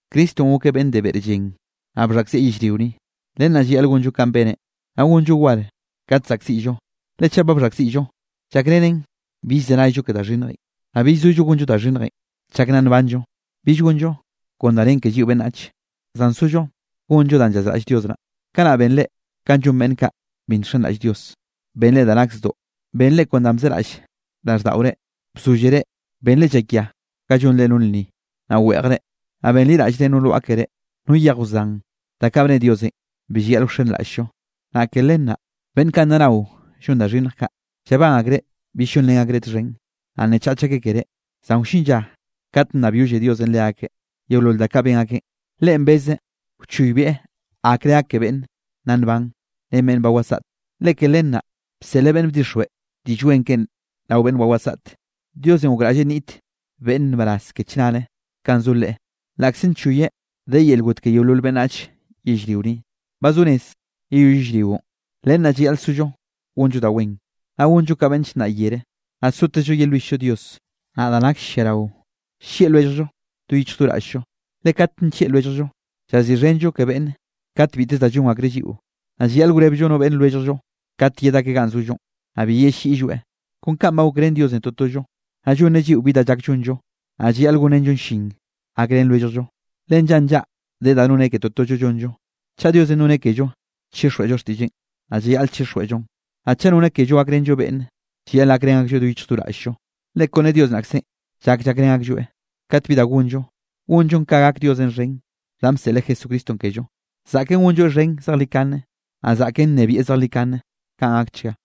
Cristonꞌ gokeꞌ beꞌnn de beꞌr llen, naꞌ bxhaꞌkzieꞌ yellrio ni, len naꞌ llayaꞌl gonllo kanꞌ beneꞌ, naꞌ gonllo war kat saꞌkziꞌllo. Le chaꞌ ba bxhaꞌkziꞌllo, llakrenen bill llzenayllo ke da xhinnjenꞌ. Naꞌ bill sollo gonllo da xhinnjenꞌ chak nna nbanllo, bill gonllo kon da nen ke lliꞌo beꞌnnach, zan sollo gonllo da llazraꞌll Dios naꞌ. Kanaꞌ benre ka llon beꞌnn kaꞌ bi nxenraꞌll Dios. Benre da nak zdoꞌ, benre kon da bzeraꞌll raꞌlldaꞌore, bzóllere, benre llakia ga llonre no lnni, naꞌ weꞌjre, naꞌ benliraꞌllre no lwaꞌa keré, no yej wzan da kaꞌ bne Diosenꞌ bi llayaꞌl wxenraꞌll-llo. Naꞌ ke len naꞌ, beꞌnn kaꞌ nna nao llon da xhinnj kaꞌ, llabán akreꞌ bill llonrén akreꞌ txhen, naꞌ nnechach akeꞌ ke reꞌ. Zan wllin lla kat nnabyolle Diosenꞌ leakeꞌ yeolol da kaꞌ ben akeꞌ, Leꞌen beze wchoybieꞌ akre gak ke beꞌnn nna nban, ren beꞌnn ba wasaꞌte. Le ke len naꞌ bseꞌleꞌ beꞌnn bdixjweꞌ Diꞌll Wen keꞌen rao beꞌnn ba wasaꞌt. Diosenꞌ gokraꞌlle nniꞌt beꞌnne nbaraz ke chnare kanꞌ zo Leꞌe, laꞌkze nchoyeꞌ de yel got ke yeolol beꞌnnach yellrio ni. Ba zo rez yeyoll yellrionꞌ. Len naꞌ llayaꞌl sollo gonllo da wen, naꞌ gonllo ka beꞌnn llnnaꞌ yere, naꞌ sotezllo yelwill-llo Dios. Naꞌ da nakll lliarao, llieꞌ lwelljllo do yichj do raꞌll-llo, le kat nllieꞌ lwelljllo, llaziꞌxhenllo ke beꞌnn kat biteze da llon akreꞌ lliꞌo. Naꞌ llayaꞌl wrebllo no beꞌnn lwelljllo kate yed akeꞌ ganꞌ zollonꞌ, naꞌ bi yelliꞌlloeꞌ. Kon kanꞌ ba gokrén Diosenꞌ totollo, naꞌ llonneꞌ lliꞌo bi da llak llonllo, naꞌ llayaꞌl gonrenllon llin gakrén lwelljllo, le nllaꞌa nllaꞌa de da nonneꞌ ke totollo llonllo. Chaꞌ Diosenꞌ nonneꞌ kello chixjweꞌllo xtiꞌlleꞌn, naꞌ llayaꞌl chixjweꞌllon. Naꞌ chaꞌ nonneꞌ kello gakrenllo beꞌnne, llayaꞌl gakrén aklloeꞌ do yichj do raꞌll-llo, le kone Dios naꞌkzenꞌ llak llakrén aklloeꞌ. Kate bi da gonllo, gonllon ka gak Diosenꞌ xhen danꞌ bseꞌleꞌ Jesucristonꞌ kello. Zaꞌken gonlloeꞌ xhen zejlikane, naꞌ zaꞌken nnebieꞌ zejlikane. Kaꞌn gakchga.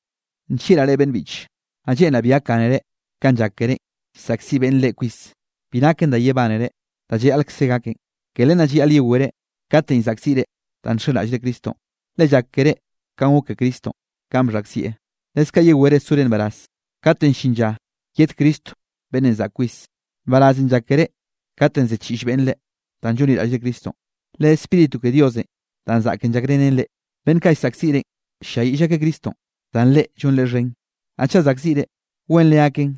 Nllieꞌraꞌ reꞌ beꞌnn biꞌche, naꞌ lleꞌnraꞌ bi gakgánere kanꞌ llak kerénꞌ llsaꞌkziꞌ beꞌnne reꞌ kwis. Bi naken da yebánere, da llayaꞌlkze gaken. Ke len naꞌ llayaꞌl yewere katenꞌ llzaꞌkziꞌre danꞌ nxenraꞌllre Cristonꞌ, le llak keré kanꞌ gok ke Cristonꞌ kanꞌ bxhaꞌkzieꞌ. Leskaꞌ yewere sore nbaraz kate llin lla yed Cristo beꞌnnenꞌ zaꞌk kwis. Nbarazenꞌ llak keré katenꞌ ziꞌchiꞌll beꞌnne reꞌ, danꞌ llonliraꞌllre Cristonꞌ, le Spíritu ke Diosenꞌ danꞌ zaꞌken llakrenen reꞌ. Beꞌnn kaꞌ llsaꞌkziꞌ reꞌn, ll-lliayiꞌll akeꞌ Cristonꞌ, zan reꞌ llonreꞌ xhen. Naꞌ chaꞌ saꞌkziꞌre, wenre gaken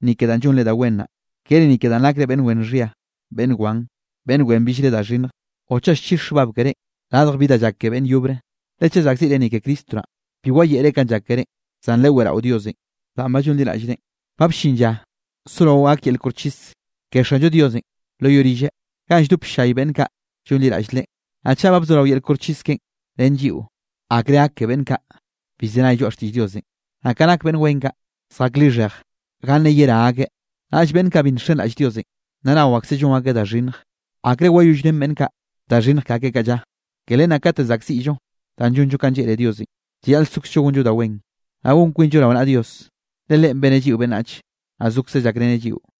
ni ke danꞌ llonre da wen naꞌ, kere ni ke danꞌ nakre beꞌnn wen xhia, beꞌnn wan, beꞌnn wen billre da xhinnj o chaꞌ llchix xhbab keré radj bi da llak ke beꞌnn yobre. Le chaꞌ saꞌkziꞌre ni ke Cristo naꞌ, bi wayeꞌre kanꞌ llak kerénꞌ, zan leweꞌrao Diosenꞌ da ba llonliraꞌllreꞌn. Ba bllin lla sorao gak yel koxchis ke Xanllo Diosenꞌ lo yoꞌ rilleꞌ, ganꞌ lldop ll-llay beꞌnn kaꞌ llonliraꞌll Leꞌe. Naꞌ chaꞌ ba bzorao yel koxchis keꞌen ren lliꞌo, ¿akreꞌ gak ke beꞌnn kaꞌ bi llzenay lloaꞌ xtiꞌll Diosenꞌ? Naꞌ ka nak beꞌnn wen kaꞌ zjak lixhej ganne yerá akeꞌ, naꞌll beꞌnn kaꞌ bi nxenraꞌll Diosenꞌ, naꞌ nao akseꞌ llon akeꞌ da xhinnj, ¿akre wayollrén beꞌnn kaꞌ da xhinnj ke akeꞌ kaꞌ lla? Ke len naꞌ kate saꞌkziꞌllo danꞌ llonllo kanꞌ lleꞌne Diosenꞌ, llayaꞌl sokzllo gonllo da wen, naꞌ gon kwinllo rao naꞌa Dios, le Leꞌen beneꞌ lliꞌo beꞌnnach, naꞌ zokzeꞌ llakreneꞌ lliꞌo.